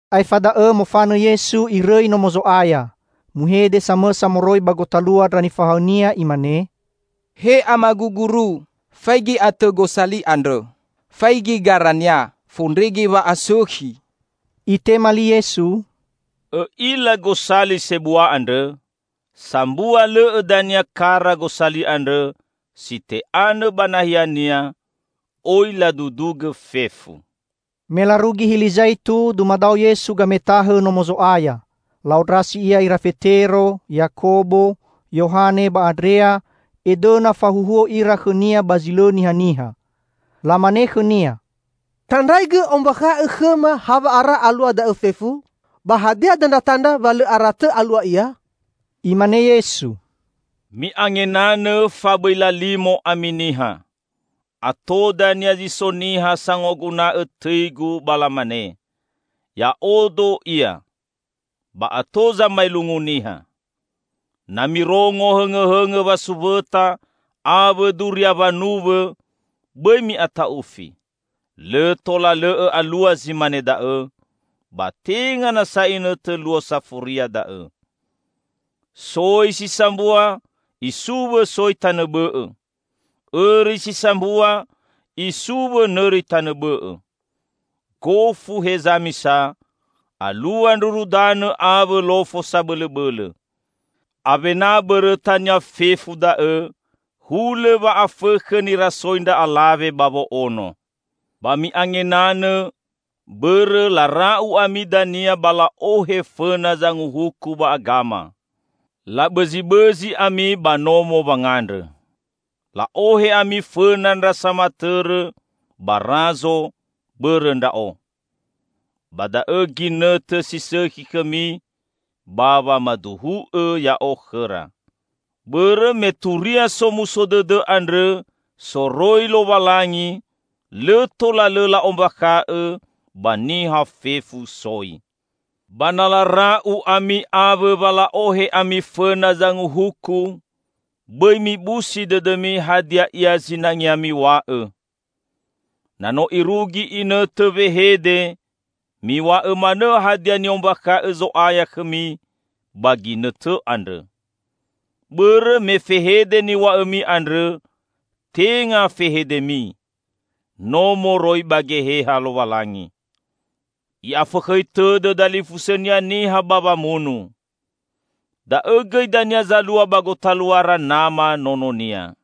Aefa da'õ mofanõ Yesu, Irõi Nomo Zo'aya. Muhede samõsa moroi ba gotalua ndra nifahaõ-Nia imane, "He Amagu Guru, faigi atõ gosali andrõ. Faigi garania. Fondrege wa'asõkhi!" Itema li Yesu, "Õ'ila gosali sebua andrõ? Sambua lõ'õ dania kara gosali andrõ si te'anõ ba nahiania. Oi ladudugõ fefu." Me larugi Hili Zaitu, dumadao Yesu gametahõ Nomo Zo'aya. La'ondrasi Ia ira Fetero, Yakobo, Yohane ba Andrea edõna fahuhuo ira khõ-Nia ba zi lõ nihaniha. Lamane khõ-Nia, "Tandraigõ ombakha'õ khõma, hawa'ara alua da'e fefu? Ba hadia dandratandra wa lõ ara tõ alua ia?" Imane Yesu, "Mi'angenanõ, fa bõi lalimo ami niha. Ato dania zi so niha sangoguna'õ tõi-Gu ba lamane, 'Ya'odo Ia!' Ba ato zamaelungu niha. Na mirongo hõngõhõngõ wasuwõta awõ duria wanuwõ, bõi mi'ata'ufi. Lõ tola lõ'õ alua zi mane da'õ, ba tenga nasa inõtõ luo safuria da'õ. Soi si sambua isuwõ soi tanõ bõ'õ. Õri si sambua isuwõ nõri tanõ bõ'õ. Gofu heza misa alua ndruru danõ awõ lofo sabõlõbõlõ. Awena bõrõtania fefu da'õ, hulõ wa'afõkhõ nirasoi ndra'alawe ba wo'ono. Ba mi'angenanõ, bõrõ lara'u ami dania ba la'ohe fõna zanguhuku ba agama. Labõzibõzi ami ba nomo wangandrõ. La'ohe ami fõna ndra samatõrõ ba razo bõrõ Ndra'o. Ba da'õ ginõtõ si sõkhi khõmi ba wamaduhu'õ Ya'o khõra. Bõrõ me turia Somuso Dõdõ andrõ soroi Lowalangi lõ tola lõ la'ombakha'õ ba niha fefu soi. Ba na lara'u ami awõ wa la'ohe ami fõna zanguhuku, bõi mibusi dõdõmi hadia ia zinangea miw̃a'õ. Na no irugi inõtõ wehede, miw̃a'õ manõ hadia ni'ombakha'õ Zo'aya khõmi ba ginõtõ andrõ. Bõrõ me fehede niw̃a'õmi andrõ tenga fehedemi. No moroi ba Geheha Lowalangi. I'afõkhõi tõdõ dalifusõnia niha ba wamunu. Da'õ gõi dania zalua ba gotaluara nama nononia.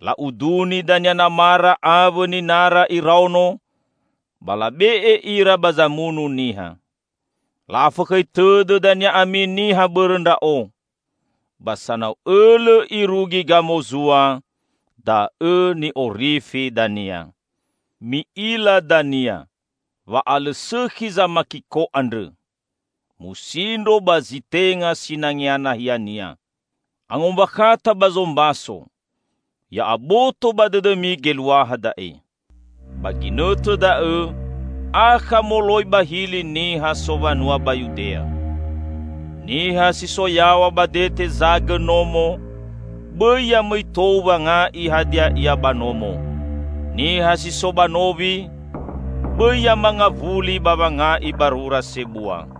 La'uduni dania namara awõ ninara iraono ba labe'e ira ba zamunu niha. La'afõkhõi tõdõ dania ami niha bõrõ Ndra'o. Ba sanau õlõ irugi gamozua da'õ ni'orifi dania." "Mi'ila dania 'Wa'alõsõkhi Zamakiko andrõ,' musindro ba zi tenga sinangea nahiania. (Angombakhata ba zombaso: Ya'aboto ba dõdõmi geluaha da'e!) Ba ginõtõ da'õ akha moloi ba hili niha sowanua ba Yudea. Niha si so yaw̃a ba dete zagõ nomo bõi yamõi tou wanga'i hadia ia ba nomo. Niha si so ba nowi bõi yamangawuli ba wanga'i barura sebua.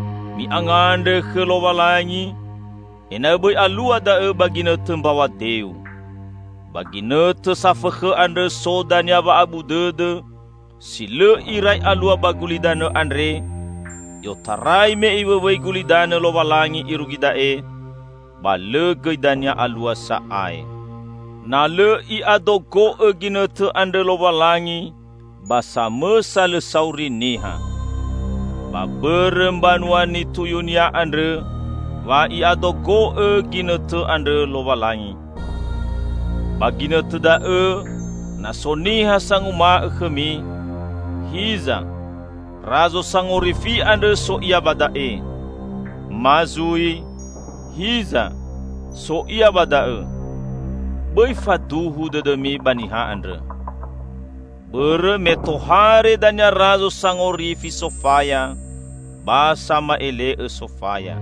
Mi'angandrõ khõ Lowalangi, ena'õ bõi alua da'õ ba ginõtõ mbaw̃a deu. Ba ginõtõ safõkhõ andrõ so dania wa'abu dõdõ, si lõ irai alua ba gulidanõ andre, i'otarai me Iwõwõi gulidanõ Lowalangi irugi da'e, ba lõ gõi dania alua sa'ae. Na lõ I'adogo'õ ginõtõ andrõ Lowalangi, ba samõsa lõ sauri niha. Ba bõrõ mbanua nituyu-Nia andrõ wa I'adogo'õ ginõtõ andrõ Lowalangi. Ba ginõtõ da'õ, na so niha sanguma'õ khõmi, 'Hiza, razo sangorifi andrõ so Ia ba da'e!' ma zui 'Hiza, so Ia ba da'õ!' -- bõi faduhu dõdõmi ba niha andrõ. Bõrõ me tohare dania razo sangorifi sofaya ba sama'ele'õ sofaya.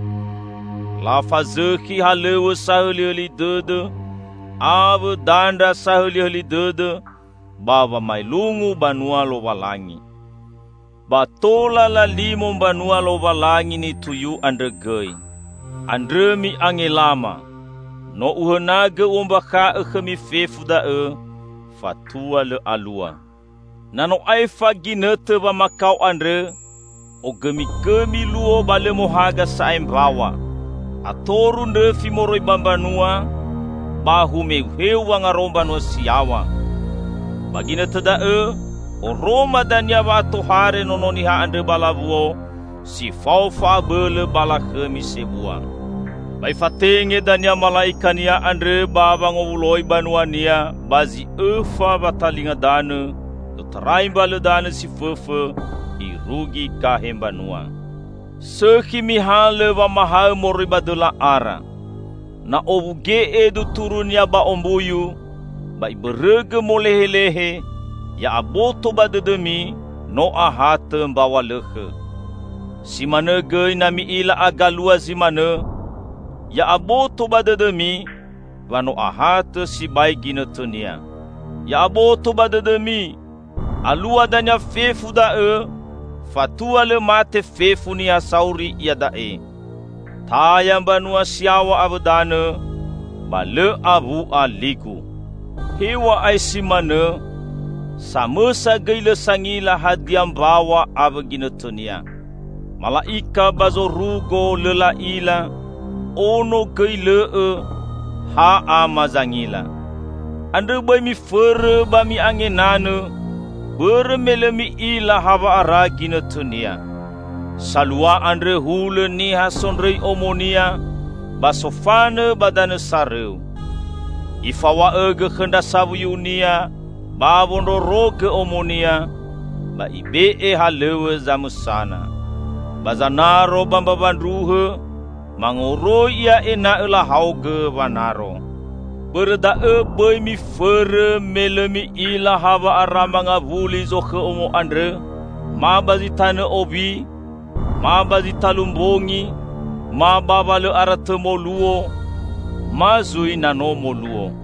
Lafazõkhi halõw̃õ sahõlihõli dõdõ awõ dandra sahõlihõli dõdõ ba wamaelungu banua Lowalangi. Ba tola lalimo mbanua Lowalangi nituyu andrõ gõi. Andrõ mi'angelama! No Uhõnagõ U'ombakha'õ khõmi fefu da'õ fatua lõ alua." "Na no aefa ginõtõ wamakao andrõ, ogõmigõmi luo, ba lõ mohaga sa'ae mbaw̃a. Atoru ndrõfi moroi ba mbanua, ba humeuheu wangaro mbanua si yaw̃a. Ba ginõtõ da'õ oroma dania wa'atohare Nono Niha andrõ ba lawuo, si fao fa'abõlõ ba lakhõmi sebua. Ba Ifatenge dania mala'ikania andrõ ba wangowuloi banua-Nia ba zi õfa watalinga danõ i'otarai mbalõ danõ si fõfõ irugi gahe mbanua." "Sõkhi mihalõ wamahaõ moroi ba dõla ara. Na owuge'e duturunia ba ombuyu, ba ibõrõgõ molehelehe, ya'aboto ba dõdõmi no ahatõ mbaw̃a lõkhõ. Si manõ gõi na mi'ila agalua zi manõ, ya aboto ba dõdõmi wa no ahatõ sibai ginõtõnia. Ya'aboto ba dõdõmi! Alua dania fefu da'õ fatua lõ mate fefu niha sauri iada'e. Taya mbanua si yaw̃a awõ danõ, ba lõ awu'a li-Gu." "Hew̃a'ae si manõ, samõsa gõi lõ sangila hadia mbaw̃a awõ ginõtõnia. Mala'ika ba zorugo lõ la'ila, Ono gõi lõ'õ, ha Ama zangila. Andrõ bõi mifõrõ ba mi'angenanõ, bõrõ me lõ mi'ila hawa'ara ginõtõnia. Salua andrõ hulõ niha sondrõi omonia ba sofanõ ba danõ sorõu. Ifaw̃a'õgõ khõ ndra sawuyunia ba wondrorogõ omonia, ba ibe'e halõw̃õ zamõsana. Ba zanaro ba mbawa ndruhõ mangoroi ia ena'õ lahaogõ wanaro. Bõrõ da'õ, bõi mifõrõ, me lõ mi'ila hawa'ara mangawuli zokhõ omo andrõ, ma ba zi tanõ owi, ma ba zi talu mbongi, ma ba wa lõ aratõ moluo, ma zui na no moluo.